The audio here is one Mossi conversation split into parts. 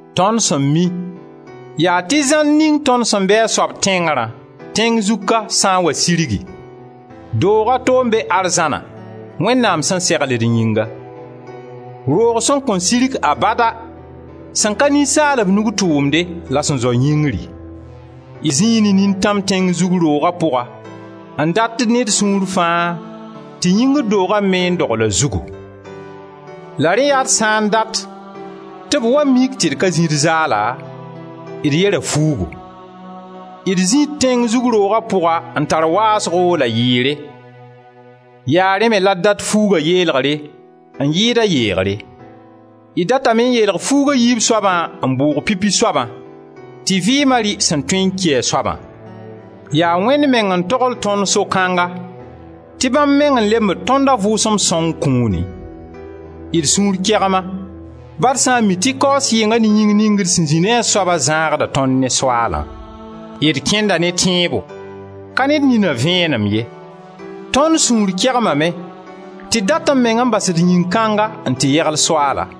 Tõnd sẽn mi, yaa tɩ zãnd ning tõnd sẽn be a soab tẽngrã, tẽng zug ka, sã n wa sirgi, doog a to n be arzãna, Wẽnnaam sẽn segl d yĩnga; roog sẽn kõn sirg abada, sẽn ka ninsaalb nug tʋʋmde la sẽn zao yĩngri. D zĩi ne nintãm tẽng zug rooga pʋga n dat ne d sũur fãa tɩ yĩngr dooga me n dogl a zugu. La rẽ yaa d sã n dat tɩ b wa mik tɩ d ka zĩ d zaala, d yera fuugu. D zĩi d tẽng zug rooga pʋga n tar waasgo la yɩɩre; yaa rẽ me la d dat fuuga yeelgre n yɩɩd a yeegre; d datame n yeelg fuug a yiib soabã n bʋʋg pipi soabã, tɩ vɩɩma rɩ sẽn tõe n ki a soabã. Yaa Wẽnd meng n togl tõnd so-kãnga tɩ bãmb meng n lembd tõnd a Vʋʋsem Sõng kũuni. D sũur kegma, ba d sã n mi tɩ kaoos yɩnga ne yĩng ning d sẽn zĩ ne a soaba zãagda tõnd ne Soaalã. D kẽnda ne tẽebo, ka ne d nina vẽenem ye. Tõnd sũur kegmame tɩ d datẽ meng n bas d yĩn-kãnga n tɩ yegl Soaala.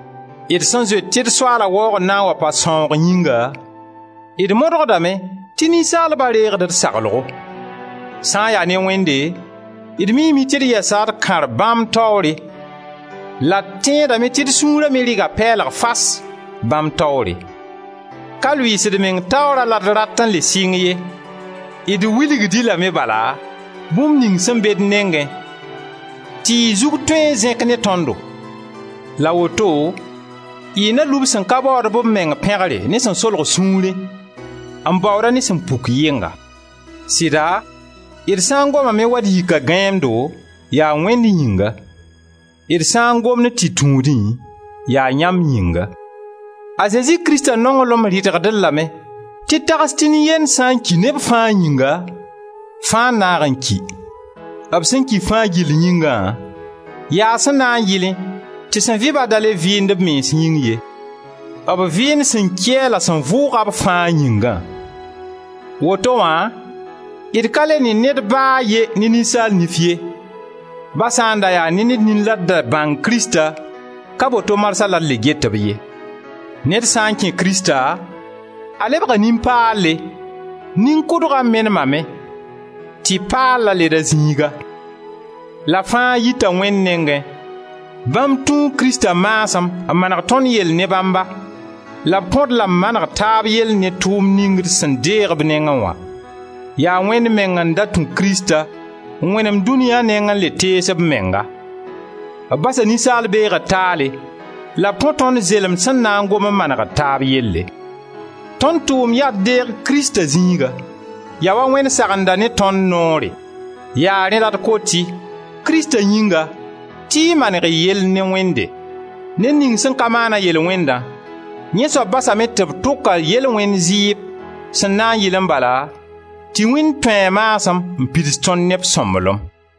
D sẽn zoet tɩ d Soaala waoogr na n wa pa sãoog yĩnga, d modgdame tɩ ninsaalba reegd d saglgo. Sã n ya ne Wẽnde, d miime tɩ d yɛsa d kãr bãmb taoore la d tẽedame tɩ d sũura me rɩga pɛɛlg fas bãmb taoore. Ka lʋɩɩs d meng taoorã la d rat n le sɩng ye, d wilgd-y lame bala bũmb ning sẽn be d nengẽ tɩ y zug tõe n zẽk ne tõndo la woto y na lub sẽn ka baood b meng pẽgre ne sẽn solg sũurẽ, n baood-a ne sẽn puk yɩnga. Sɩda d sã n gomame waa d yika gãeemdo, yaa Wẽnd yĩnga; d sã n gomd tɩ tũudẽ, yaa yãmb yĩnga. A Zezi Krista nonglem rɩdgd-d lame tɩ d tags tɩ nin-yend sã n ki neb fãa yĩngã, fãa n naag n ki. B sẽn ki fãa gill yĩngã, yaa sẽn na n yɩlẽ tɩ sẽn vɩ-ba da le vɩɩnd d mens yĩng ye, b vɩɩnd sẽn ki-a la sẽn vʋʋg-a b fãa yĩnga. Woto wã d ka le ne ned ba a ye ne ninsaal nif ye. Ba sã n da yaa ne d nin la d da bãng Krista, ka boto marsã la d le get-b ye. Ned sã n kẽ Krista a lebga nin-paalle, nin-kʋdga menemame tɩ paalla led a zĩiga. La fãa yita Wẽnd nengẽ, bãmb tũu Krista maasem n maneg tõnd yell ne bãmba la b kõ-d la maneg taab yell ne tʋʋmd ning d sẽn deeg b nengẽ wã. Yaa Wẽnd meng n da tũ Krista n wẽnemd dũniya neng n le tees b menga; b basa ninsaal beegr taale la b kõ tõnd zelemd sẽn na n gom n maneg d taab yelle. Tõnd tʋʋmd yaa d deeg Krista zĩiga. Yaa wa Wẽnd sagenda ne tõnd noore. Yaa rẽ la d kot-y, Krista yĩnga, tɩ y maneg y yell ne Wẽnde. Ned ning sẽn ka maana yel-wẽndã, yẽ soab basame tɩ b tʋk-a yel-wẽnd zɩɩb, sẽn na n yɩlẽ bala tɩ Wẽnd tũ a maasem n pids tõnd ne b sõmblem.